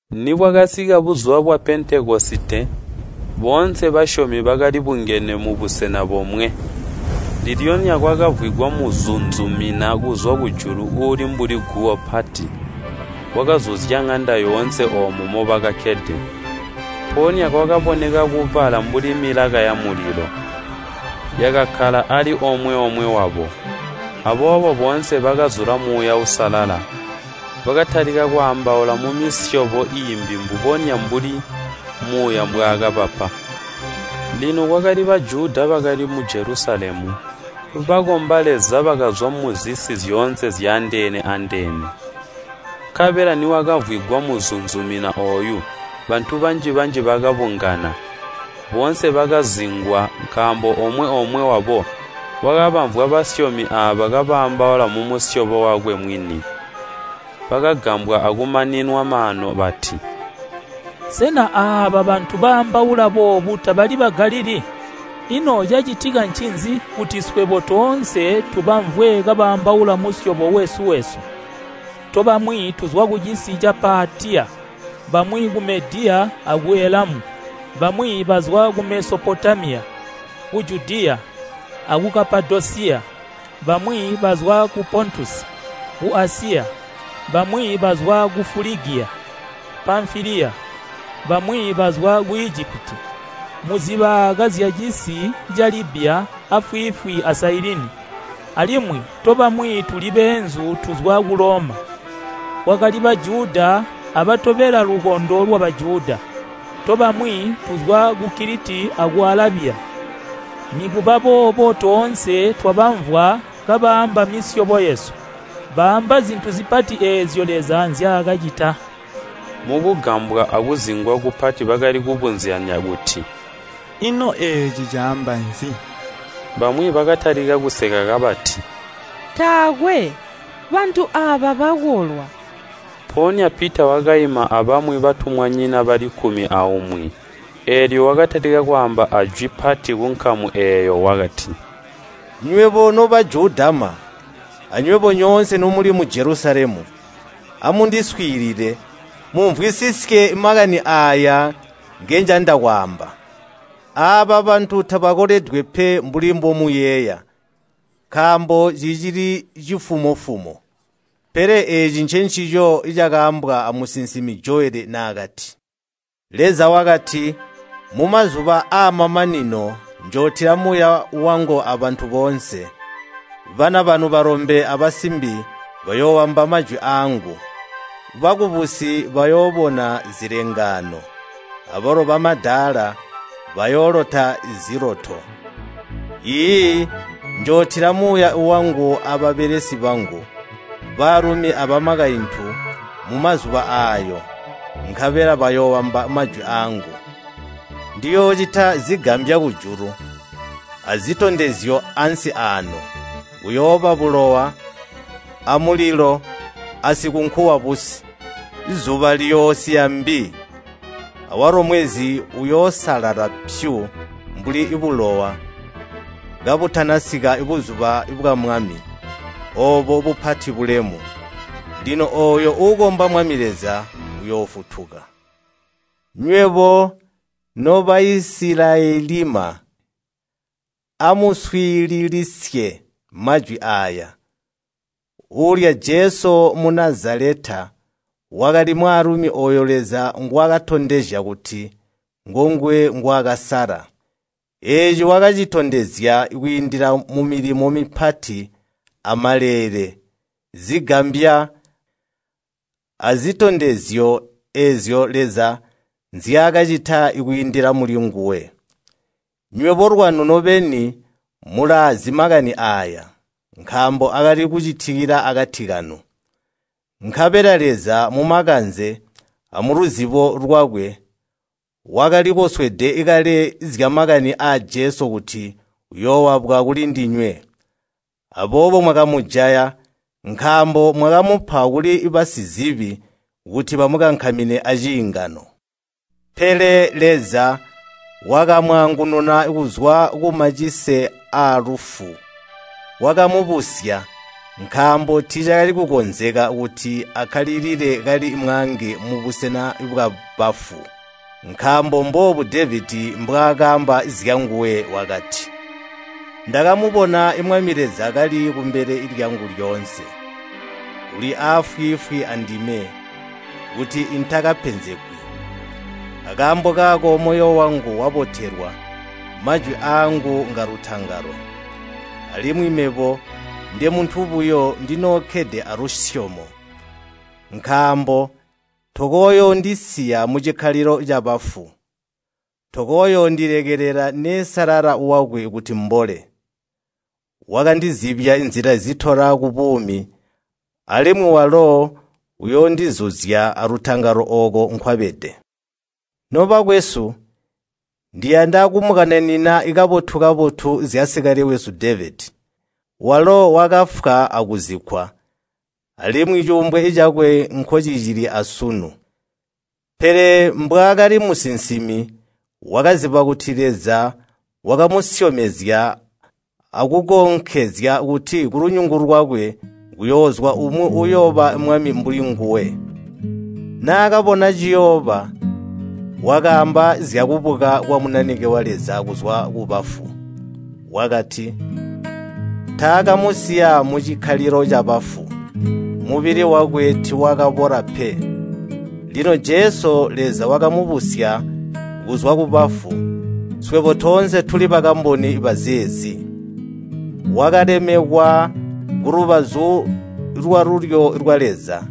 Nibwakasika buzuba bwa Pentekosite, boonse basyomi bakalibungene mubusena bomwe. Ndilyonya kwakamvwigwa muzunzumina kuzwa kujulu uuli mbuli guwo pati, wakazuzya ŋanda yoonse oomo mobakakkede. Mpoonya kwakaboneka kubala mbuli milaka yamulilo, yakakkala ali omwe-omwe wabo. Aboobo boonse bakazula Muuya Uusalala, bakatalika kwaambaula mumisyobo iimbi mbubonya mbuli Muuya mbwaakabapa. Lino kwakali Bajuda bakali mu Jelusalemu, bakomba Leza bakazwa muzisi zyoonse zyandeene-andeene. Nkabela niwakamvwigwa muzunzumina ooyu, bantu banji-banji bakabungana. Boonse bakazingwa nkaambo omwe-omwe wabo wakabamvwa basyomi aabo kabaambaula mumusyobo wakwe mwini. Bakagambwa akumaninwa maanu bati, “Sena aaba bantu baambaula boobu tabali Bagalilii? Ino cacitika ncinzi kuti swebo toonse tubamvwe kabaambaula musyobo wesu-wesu? Tobamwi tuzwa kucisi ca Paatiya, bamwi ku Mediya aku Elamu, bamwi bazwa ku Mesopotamiya, ku Judiya, aku Kapadosiya, bamwi bazwa ku Pontusi, ku Asiya, bamwi bazwa ku Fuligiya, Pamfiliya, bamwi bazwa ku Ijipiti, muzibaaka zyacisi ca Libya afwiifwi a Sailini, alimwi tobamwi tuli beenzu tuzwa ku Loma. Kwakali Bajuda abatobela lukondo lwa Bajuda. Tobamwi tuzwa ku Kiliti aku Alabiya, nikubaboobo toonse twabamvwa kabaamba misyobo yesu, baamba zintu zipati eezyo Leza nzyaakacita!” Mukugambwa akuzingwa kupati bakali kubuzyanya kuti, “Ino eeci caamba nzi?” Bamwi bakatalika kuseka kabati, “Taakwe, bantu aaba bakolwa!” Mpoonya Pita wakaima abamwi batumwanyina bali kkumi aumwi. Eelyo wakatalika kwaamba ajwi pati kunkamu eeyo, wakati, “Nywebo no Bajudama, anywebo nyoonse nomuli mu Jelusalemu, amundiswiilile, mumvwisisye makani aaya ngenjanda kwaamba. Aaba bantu tabakoledwe pe mbuli mbomuyeeya, nkaambo cicili cimafumo-fumo. Pele eeci ncencico cakaambwa amusinsimi Joweli naakati, ‘Leza wakati, Mumazuba aamamanino, njootila Muuya wangu abantu boonse. Bana banu balombe abasimbi bayooamba majwi aangu. Bakubusi bayoobona zilengaano, abalo bamadaala bayoolota ziloto. Iiyi, njootila Muuya wangu ababelesi bangu, baalumi abakaintu mumazuba aayo, nkabela bayooamba majwi aangu. Ndiyoocita zigambya kujulu, azitondezyo ansi aano. Kuyooba bulowa, amulilo, asikunku wabusi. Zuba liyoosiya mbi, awalo mwezi uyoosalala pyu mbuli bulowa, kabutanasika buzuba bwa Mwami, oobo bupati bulemu. Lino ooyo uukomba Mwami Leza uyoofutuka!’” “Nywebo no Baisilayelima, amuswiililisye majwi aaya! Uulya Jesu Munazaleta, wakali mwaalumi ooyo Leza ngwaakatondezya kuti ngonguwe ngwaakasala. Eeci wakacitondezya kwiindila mumilimo mipati, amaleele, zigambya, azitondezyo eezyo Leza nzyaakacita kwiindila mulinguwe. Nywebo lwanu nobeni mulaazi makani aaya, nkaambo akali kucitikila akati kanu. Nkabela Leza, mumakanze amuluzibo lwakwe, wakalikoswede kale zyamakani aa Jesu kuti uyooabwa kulindinywe. Aboobo mwakamujaya, nkaambo mwakamupa kuli basizibi kuti bamukankamine aciingano. Pele Leza wakamwaangununa kuzwa kumacise aalufu, wakamubusya, nkaambo tiicakali kukonzeka kuti akkalilile kali mwaange mubusena bwabafu. Nkaambo mboobu Devedi mbwaakaamba zyanguwe wakati, ‘Ndakamubona Mwami Leza kali kumbele lyangu lyoonse, uli aafwiifwi andime, kuti intakapenzegwi. Akaambo kaako moyo wangu wabotelwa, majwi aangu ngalutangalo. Alimwi mebo, ndemuntu buyo, ndinookkede alusyomo. Nkaambo tokooyoondisiya mucikkalilo cabafu. Tokooyoondilekelela neesalala wakwe kuti mbole. Wakandizibya nzila zitola kubuumi, alimwi walo uyoondizuzya alutangalo ooko nkwabede.’ “Nobakwesu, ndiyanda kumukananina kabotu-kabotu zyasikale wesu Devedi. Walo wakafwa akuzikkwa, alimwi cuumbwe cakwe nkocicili asunu. Pele mbwaakali musinsimi, wakaziba kuti Leza wakamusyomezya akukonkezya kuti kulunyungu lwakwe kuyoozwa umwi uyooba mwami mbuli nguwe. Naakabona ciyooba, wakaamba zyakubuka kwa Munanike wa Leza kuzwa kubafu. Wakati, ‘Taakamusiya mucikkalilo cabafu, mubili wakwe tiiwakabola pe!’ Lino Jesu Leza wakamubusya kuzwa kubafu, swebo toonse tuli bakamboni bazeezi. Wakalemekwa kulubazu lwalulyo lwa Leza,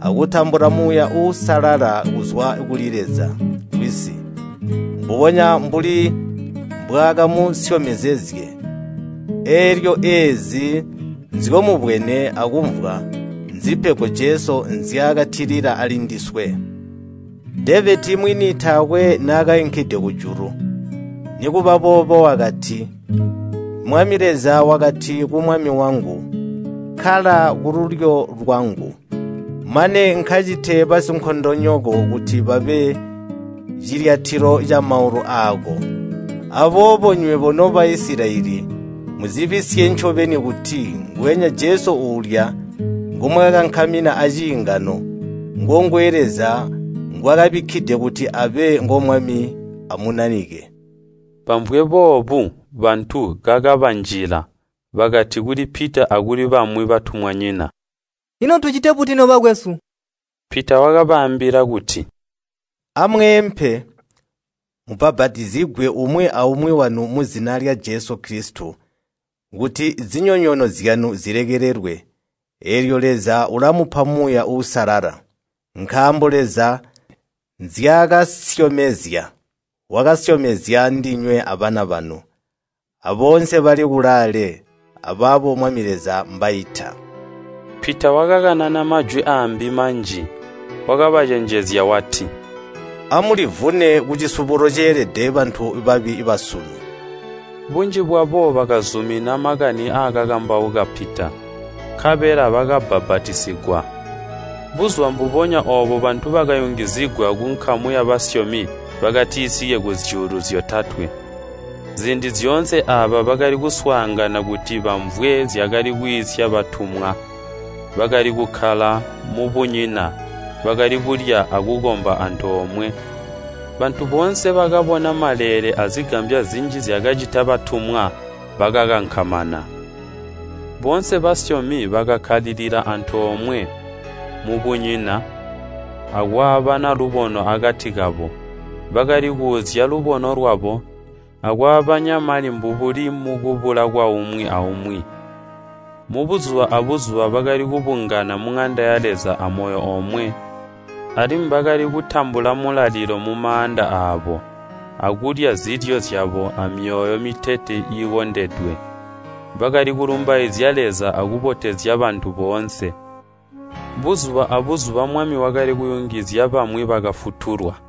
akutambula Muuya Uusalala kuzwa kuli Leza Wisi, mbubonya mbuli mbwaakamusyomezezye. Eelyo eezi nzyomubwene akumvwa nzipego Jesu nzyaatilila alindiswe. Devedi mwini taakwe naakainkide kujulu, nikuba boobo wakati, ‘Mwami Leza wakati ku Mwami wangu, kkala kululyo lwangu. Mane nkacite basinkondonyoko kuti babe cilyatilo camaulu aako.’ “Aboobo nywebo no Baisilayeli muzibisye ncobeni kuti nguwenya Jesu uulya ngomwakakankamina aciingano, ngonguwe Leza ngwaakabikkide kuti abe ngo Mwami a Munanike!” Bamvwe boobu bantu kakabanjila. Bakati kuli Pita akuli bamwi batumwanyina, “Ino tucite buti, nobakwesu?” Pita wakabaambila kuti, “Amweempe, mubbapatizigwe umwi aumwi wanu muzina lya Jesu Kilisito, kuti zinyonyoono zyanu zilekelelwe, eelyo Leza ulamupa Muuya Uusalala. Nkaambo Leza nzyaakasyomezya, wakasyomezya ndinywe abana banu, aboonse bali kulaale, abaabo Mwami Leza mbaita.” Pita wakakanana majwi aambi manji, wakabacenjezya wati, “Amulivune kucisubulo ceelede bantu babi basunu.” Bunji bwabo bakazumina makani aakakambauka Pita, nkabela bakabbapatizigwa. Buzuba mbubonya oobo bantu bakayungizigwa kunkamu yabasyomi bakatisike kuzyuulu zyotatwe. Ziindi zyoonse aaba bakali kuswaangana kuti bamvwe zyakali kwiisya batumwa. Bakali kukkala mubunyina, bakali kulya akukomba antoomwe. Bantu boonse bakabona maleele azigambya zinji zyakacita batumwa, bakakankamana. Boonse basyomi bakakkalilila antoomwe mubunyina, akwaabana lubono akati kabo. Bakali kuuzya lubono lwabo, akwaabanya mali mbubuli mukubula kwaumwi aumwi. Buzuba abuzuba bakali kubungana muŋanda ya Leza amoyo omwe, alimwi bakali kutambula Mulalilo mumaanda aabo, akulya zilyo zyabo amyoyo mitete iikondedwe. Bakali kulumbaizya Leza akubotezya bantu boonse. Buzuba abuzuba Mwami wakali kuyungizya bamwi bakafutulwa.